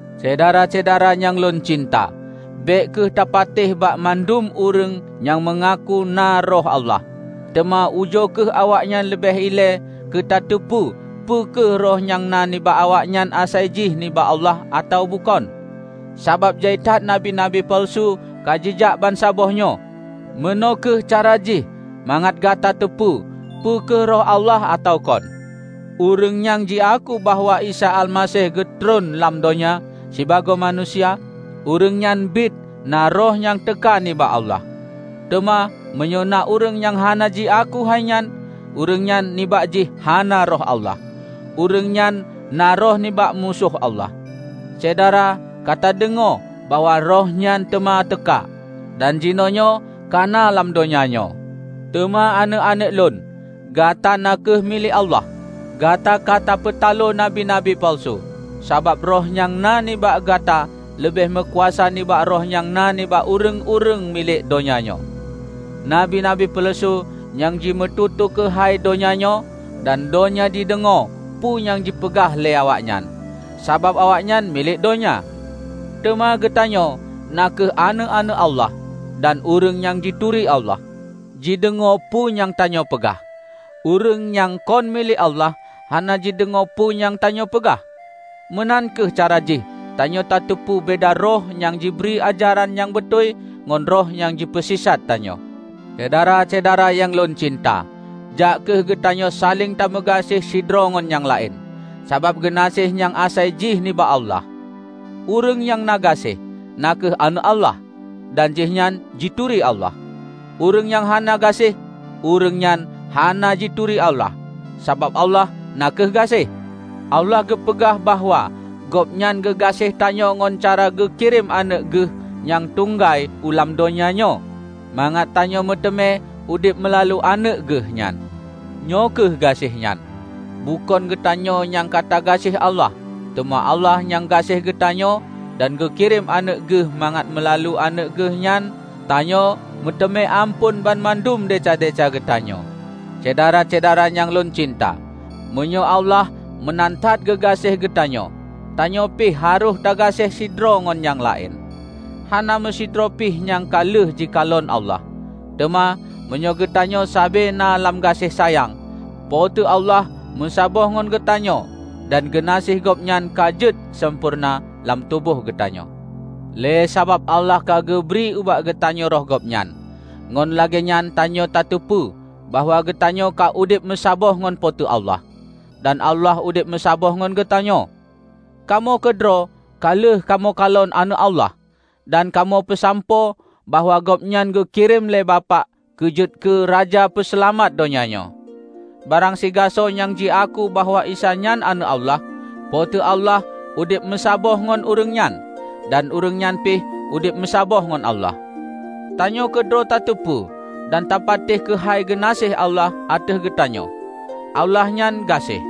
Syedara-syedara nyang lôn cinta! Bék kheueh tapatéh bak mandum ureuëng nyang meungaku na Roh Allah, teuma ujoe kheueh awaknyan leubeh ilée keutateupeue peu kheueh roh nyang na nibak awaknyan asai jih nibak Allah atawa bukon. Sabab jai that nabi-nabi peuleusu ka jijak bansaboh nyoe. Meunoe kheueh cara jih mangat gata teupeue peu kheueh Roh Allah atawa kon: Ureuëng nyang jiaku bahwa Isa Almaseh geutreun lam donya sibagoe manusia, ureuëng nyan biet na Roh nyang teuka nibak Allah. Teuma meunyoe na ureuëng nyang hana jiaku hai nyan, ureuëng nyan nibak jih hana Roh Allah. Ureuëng nyan na roh nibak Musoh Almaseh. Syedara ka tadeungoe bahwa roh nyan teuma teuka, dan jinoenyoe kana lam donya nyoe. Teuma Aneuëk-aneuëk lôn, gata na kheueh milék Allah. Gata ka tapeutalo nabi-nabi peuleusu, sabab Roh nyang na nibak gata leubeh meukuasa nibak roh nyang na nibak ureuëng-ureuëng milék donya nyoe. Nabi-nabi peuleusu nyan jimeututoe keuhai donya nyoe, dan donya jideungoe peue nyang jipeugah lé awaknyan, sabab awaknyan milék donya. Teuma geutanyoe na kheueh aneuëk-aneuëk Allah; dan ureuëng nyang jituri Allah, jideungoe peue nyang tanyoe peugah. Ureuëng nyang kon milék Allah, hana jideungoe peue nyang tanyoe peugah. Meunan kheueh cara jih tanyoe tateupeue beda Roh nyang jibri ajaran nyang beutôi ngon roh nyang jipeusisat tanyoe. Syedara-syedara nyang lôn cinta! Jak kheueh geutanyoe saléng tameugaséh sidroe ngon nyang laén, sabab geunaséh nyan asai jih nibak Allah. Ureuëng nyang na gaséh, na kheueh aneuëk Allah dan jihnyan jituri Allah. Ureuëng nyang hana gaséh, ureuëng nyan hana jituri Allah; sabab Allah na kheueh gaséh. Allah geupeugah bahwa Gobnyan geugaséh tanyoe ngon cara geukirém Aneuëk Geuh nyang tunggai u lam donya nyoe mangat tanyoe meuteumé udeb meulalu Aneuëk Geuh nyan. Nyoe kheueh gaséh nyan: Bukon geutanyoe nyang ka tagaséh Allah, teuma Allah nyang gaséh keugeutanyoe dan geukirém Aneuëk Geuh mangat meulalu Aneuëk Geuhnyan tanyoe meuteumé amphon banmandum desya-desya geutanyoe. Syedara-syedara nyang lôn cinta, meunyoe Allah meunan that geugaséh geutanyoe, tanyoe pih harôh tagaséh sidroe ngon nyang laén. Hana meusidroe pih nyang ka lheueh jikalon Allah, teuma meunyoe geutanyoe sabe na lam gaséh sayang, Po teu Allah meusaboh ngon geutanyoe dan geunaséh Gobnyan ka jeuet sampoereuna lam tuboh geutanyoe. Lé sabab Allah ka geubri ubak geutanyoe Roh Gobnyan, ngon lagée nyan tanyoe tateupeue bahwa geutanyoe ka udeb meusaboh ngon Po teu Allah, dan Allah udeb meusaboh ngon geutanyoe. Kamoe keudroe ka lheueh kamoe kalon Aneuëk Allah, dan kamoe peusampoe bahwa Gobnyan geukirém lé Bapak keu jeuet keu Raja Peuseulamat donya nyoe. Barang sigasoe nyang jiaku bahwa Isa nyan Aneuëk Allah, Po teu Allah udeb meusaboh ngon ureuëng nyan, dan ureuëng nyan pih udeb meusaboh ngon Allah. Tanyoe keudroe tateupeu dan tapatéh keuhai geunaséh Allah ateueh geutanyoe. Allah nyan gaséh.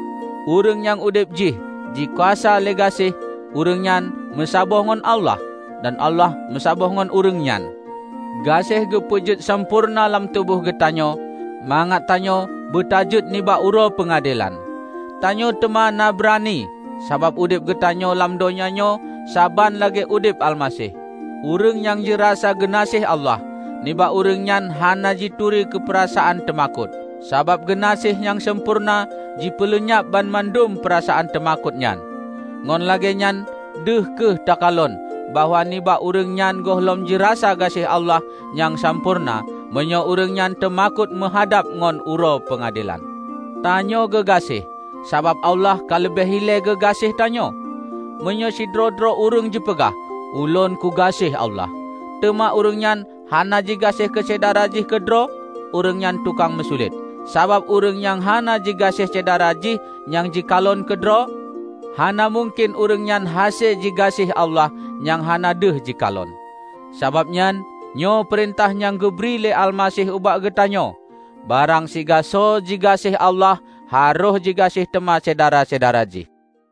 Ureuëng nyang udeb jih jikuasa lé gaséh, ureuëng nyan meusaboh ngon Allah, dan Allah meusaboh ngon ureuëng nyan. Gaséh geupeujeuet sampoereuna lam tuboh geutanyoe, mangat tanyoe beutajeuet nibak Uroe Peungadelan. Tanyoe teuma na beurani, sabab udeb geutanyoe lam donya nyoe saban lagée udeb Almaseh. Ureuëng nyang jirasa geunaséh Allah, nibak ureuëng nyan hana jituri keupeurasaan teumakot; sabab geunaséh nyang sampoereuna jipeuleunyab banmandum peurasaan teumakot nyan. Ngon lagée nyan deuh kheueh teukalon bahwa nibak ureuëng nyan gohlom jirasa gaséh Allah nyang sampoereuna meunyoe ureuëng nyan teumakot meuhadab ngon Uroe Peungadelan. Tanyoe geugaséh, sabab Allah ka leubeh ilée geugaséh tanyoe. Meunyoe sidroe-droe ureuëng jipeugah, "Ulôn kugaséh Allah," teuma ureuëng nyan hana jigaséh keusyedara jih keudroe, ureuëng nyan tukang meusulet. Sabab ureuëng nyang hana jigaséh syedara jih nyang jikalon keudroe, hana mungken ureuëng nyan hase jigaséh Allah nyang hana deuh jikalon. Sabab nyan, nyoe peurintah nyang geubri lé Almaseh ubak geutanyoe: Barang sibagoe jigaséh Allah harôh jigaséh teuma syedara-syedara jih.